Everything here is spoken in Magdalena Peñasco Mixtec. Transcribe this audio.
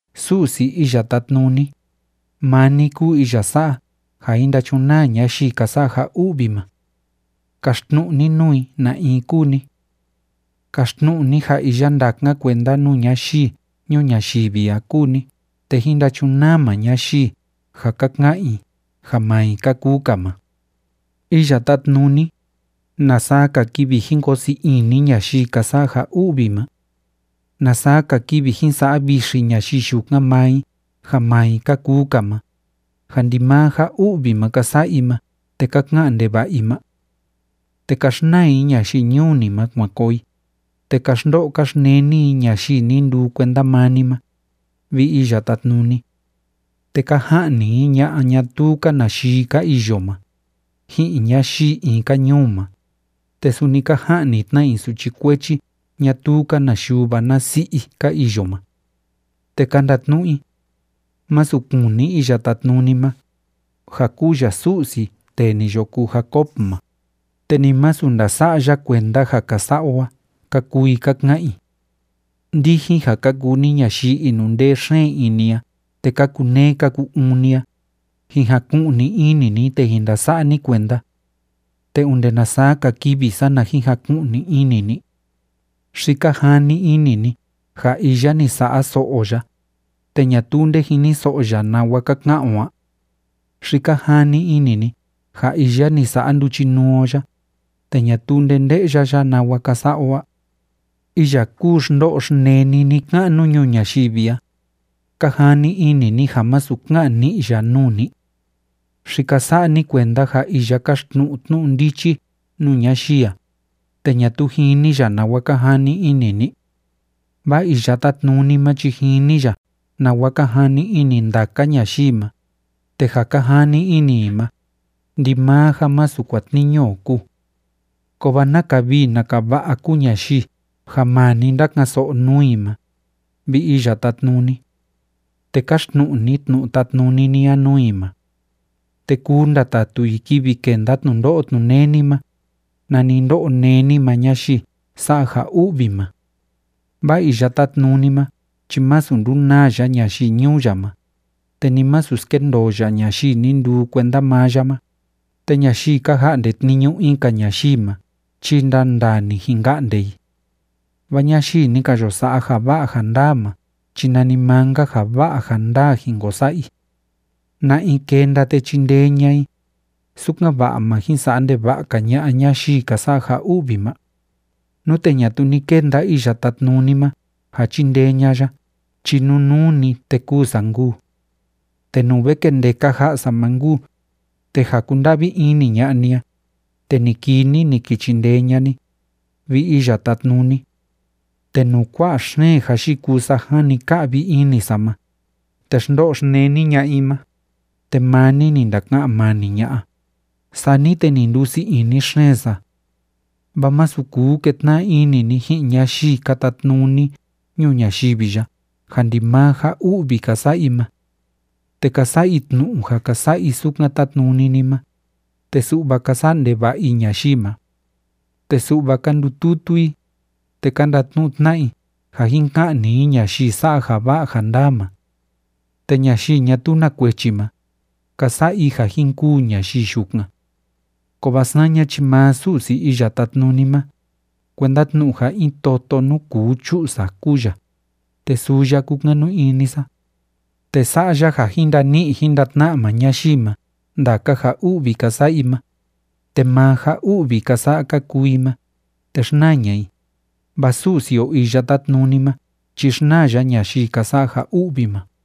Su'si Iya Tátnuni, maa ni kúu iya sa'a ja jin ndachunaa ñayii ka sa'a ja u'vi ma. ¡Kaxtnu'u ni nuu i na in kúu ni! Kaxtnu'u ni ja iya ndákan kuenda nuu ñayii ñuu ñayivi a kúu ni te jín ndachunaa maa ñayii ja ka ka'an i ja maa i ka kuu‑ka ma. Iya Tátnuni, ¿na saa‑ka kivi jin koo sii ini ñayii ka sa'a ja u'vi ma? ¿Na saa‑ka kivi jin sa'a vixi ñayii yukan maa i ja maa i ka kuu‑ka ma, ja ndimaa ja u'vi ma ka sa'a i ma te ka ka'an ndeva'a i ma? Te ka xnaa i ñayii ñuu ni ma kuan koo i, te ka xndo'o ka xneni i ñayii ni nduu kuenda maa ni ma, vi Iya Tátnuni. Te ka ja'ni i ña'a ñatuu‑ka na yii ka iyo ma, ji'in ñayii in‑ka ñuu ma, te suni ka ja'ni tna i suchi kuechi ñatuu‑ka na yuva na si'i i ka iyo ma. Te ka ndatnu'u i: “Másu kuni Iya Tátnuni ma, ja kúu ya Su'si tee ni yo kuu Jacob ma, te ni masu ndasa'a ya kuenda ja ka sa'a o a”, ka kuu i ka ka'an i. Ndijin ja ka kuu ni ñayii inundee xeen ini a te ka kuneé ka ku‑uun ni a, jin jaku'ni ini ni te jin ndasa'a ni kuenda. ¿Te onde na saa‑ka kivi, sana jin jaku'ni ini ni? ¿Xi ka jani ini ni ja iya ni sa'a so'o o ya, te ñatuu nde jiniso'o ya nawa ka ka'an o a? ¿Xi ka jani ini ni ja iya ni sa'a nduchinuu o ya, te ñatuu nde nde'ya ya nawa ka sa'a o a? Iya kuu xndo'o xneni ni‑ka'nu ñuu ñayivi a, ¿ka jani ini ni ja masu ka'an ni'i ya nuu ni? ¿Xi ka sa'a ni kuenda ja iya káxtnu'u tnu'u ndichi nuu ñayii a, te ñatuu jini ya nawa ka jani ini ni? Vaa Iya Tátnuni ma chi jini ya nawa ka jani ini ndaka ñayii ma, te ja ka jani ini i ma, ndimaa ja masu kuatniñu o kúu. ¡Kovaa naka vii naka va'a kúu ñayii ja maa ni ndáka'an‑so'o nuu i ma, vi Iya Tátnuni! Te káxtnu'u ni tnu'u tátnuni ni a nuu i ma. Te kuu ndatatu i kivi kenda tnundo'o tnuneni ma, nani ndó'o néni maa ñayii sa'a ja u'vi ma. Vaa Iya Tátnuni ma chi masu ndunaa ya ñayii ñuu ya ma, te ni masu skendoo ya ñayii ni nduu kuenda maa ya ma. Te ñayii ka ja'nde tniñu in‑ka ñayii ma chi ndandaa‑ni jin ka'nde i. Vaa ñayii ni ka yo sa'a ja va'a ja ndaa ma chi nanimaa‑nka ja va'a ja ndaa jin ko sa'a i. ¿Na in kenda te chindee ña'a i, sukan‑va'a ma jin sa'a ndeva'a‑ka ña'a ñayii ka sa'a ja u'vi ma? Nute ñatuu ni kenda Iya Tátnuni ma ja chindee ña'a ya chi nunuu‑ni, te kûu sa nkuu. Te nuu ve kendeka ja'a sa ma nkuu, te ja kúnda'vi ini ña'a ni a, te ni kii ni, ni ki chindee ña'a ni, vi Iya Tátnuni. Te nuu kua'a xeen ja yikuu sa jani ka'vi ini sa ma, te xndo'o xneni ña'a i ma, te maa ni ni ndaka'an mani ña'a, sani te ni ndusii ini xeen sa. Vaa masu kuu ketna'a ini ni ji'in ñayii ka tatnuni ñuu ñayivi ya ja ndimaa ja u'vi ka sa'a i ma. Te ka sa'a i tnu'u ja ka sa'a i sukan tátnuni ni ma, te su'va ka sa'a ndeva'a i ñayii ma. Te su'va ka ndututu i, te ka ndatnu'u tna'a i ja jin ka'ni i ñayii sa'a ja va'a ja ndaa ma. Te ñayii ñatuu na kuechi ma, ka sa'a i ja jin kûu ñayii yukan. Kovaa saña chi maa Su'si Iya Tátnuni ma, kuenda tnu'u ja in toto nuu kuu chu'u sa kúu ya, te suu ya kúkanu ini sa. Te sa'a ya ja jin ndani'i jin ndatna'a maa ñayii ma ndaka ja u'vi ka sa'a i ma, te maa ja u'vi ka sa'a ka kuu i ma, te xnaa ña'a i, vaa Su'si o Iya Tátnuni ma chi xnaa ya ñayii ka sa'a ja u'vi ma.